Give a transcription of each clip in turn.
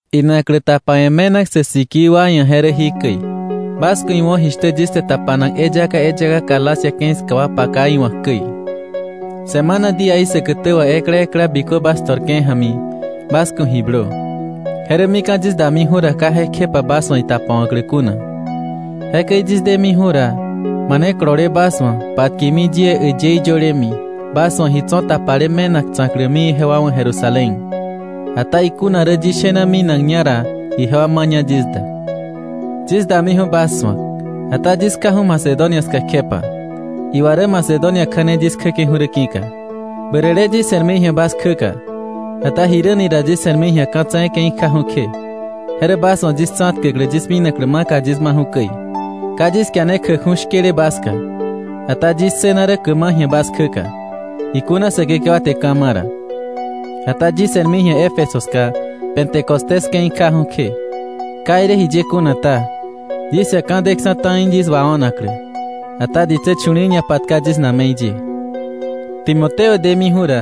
Inaklä tapawe̱ me̱nak sä sikii wa ia̱ je rä jikäi. Bas ku̱ iwo̱ jishtä yis te tapanak eyaka eyaka Galacia ke̱i ska wa paka iwa̱k käi. Semana díaí säkätä wà ekla ekla bikö bas to̱rke̱ ja̱mi bas ku̱ ji blö. Je rä mika̱ yis damiju̱ ra, ka jekjepa bas wa̱ itapawa̱klä kuna. Jekäi yis demiju̱ ra, mane kolole bas wa̱, patkemi yie äyëí yölemi, bas wa̱ ji tso̱ tapale me̱nak tsa̱klämi ijewa wa̱ Jerusalén. Ata ikuna rä yis shena minakña ra, ijewa maña yis da. Yis damiju̱ bas su̱ak, ata yis kjaju̱ Macedonia ska kjepa. Iwa rä Macedonia kja̱ne yis kjäke̱ju̱ rä ki̱ka. Bärä le yis se̱rmi ji̱a bas kjäka, ata jiräni ra yis se̱rmi ji̱a ka̱ tse̱e̱ ke̱i kjaju̱ kje. Je rä bas wa̱ yis tsa̱tkäklä yis minaklä maka yis maju̱ käi. Ka yis kiane kjäkju̱ shkële bas ska, ata yis ssëna rä käma ji̱a bas kjäka, ikuna Säkekewa te ka̱ ma̱ ra. Ata yis se̱rmi ji̱a Éfeso ska Pentecostés ke̱i kjaju̱ kje. Ka irä jiye kuna ta, yis ia̱ ka̱ deksa̱ ta̱i yis wao̱naklä. Ata ditsä chu̱li̱i̱ ñapatka yis na̱me̱i ye. Timoteo demiju̱ ra,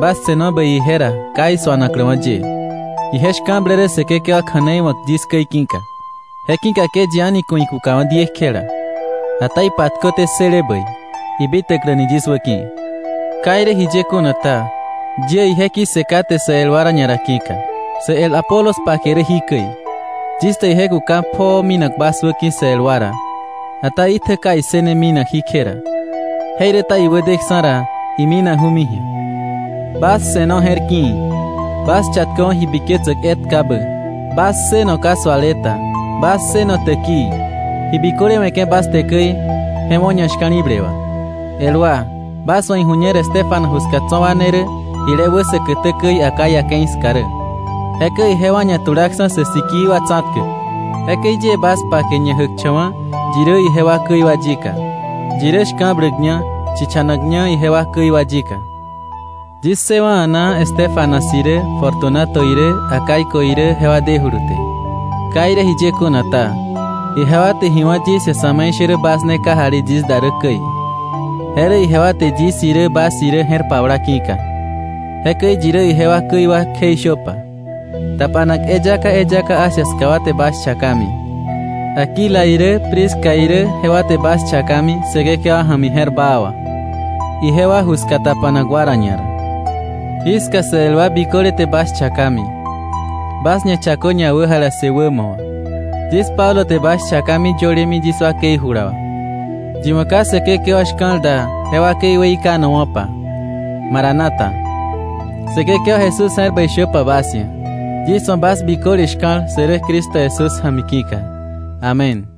bas se̱no bäi ije ra ka isu̱anakläwa̱ ye, ije shka̱blä rä Säkekewa kja̱nei wa̱k yis käi ki̱ka. Je ki̱ka ke yi a̱ni ku̱ ikukawa̱ diekjela, ata ipatköté ssële bäi, ibitäkläni yis wäki̱. Ka irä jiye kuna ta, yie ije ki̱ssë kate sä el wa ra ñara ki̱ka. Sä el Apolos pake rä jikäi. Yis te ije kuka pjoo minak bas wäki̱ sä el wa ra, ata itjä ka issëne minak jíkje ra. Jeiräta iwä deksa̱ ra iminaju̱mi ji̱a. Bas se̱no je̱r ki̱i̱. Bas chatköwa̱ ji biketsäk etkabä. Bas ssëno ka suale ta. Bas ssëno täkii. Ji biköle we̱ke̱ bas te käi, je wo̱ ñashka̱li̱ble wà. El wa, bas wa̱ iju̱ñer Estéfanas ju ska tso̱ wa ne rä jile wä säkätä käi Acaya ke̱i ska rä, jekäi ijewa ñatulaksa̱ sä sikii wa tsa̱tkäk. Jekäi yie bas pake, ñajäkcha̱wa̱ yi rä ijewa käi wa yika, yi rä shka̱bläkña chichanakña ijewa käi wa yika. Yis ssëwa̱ a̱naa Estéfanas irä Fortunato irä Acaico irä jewa dejulu te. Ka irä jiye kuna ta, ijewa te ji wá̱ yis ia̱ sa̱me̱ishärä bas ne kajali yis da rä käi. Je rä ijewa te yis irä bas irä je̱r pabla ki̱ka. Jekäi yi rä ijewa käi wa kjeishöpa. Tapanak eyaka eyaka Asia ska wa te bas chakami. Aquila irä Prisca irä jewa te bas chakami Säkekewa ja̱mi je̱r baa wà, ijewa ju ska tapanak wa ra ñara. Jiska sä el wa biköle te bas chakami. Bas ñachakö ñawäjalassë wämo wà. Yis Pablo te bas chakami yölemi yis wakei jula wà. Yi wa̱ ka Säkekewa shka̱l da, je wakei weikanowa̱pa. Maranata. Säkekewa Jesús je̱r bäi shöpa bas ia̱. Yis wa̱ bas biköle shka̱l sä rä Cristo Jesús ja̱mi ki̱ka. Amén.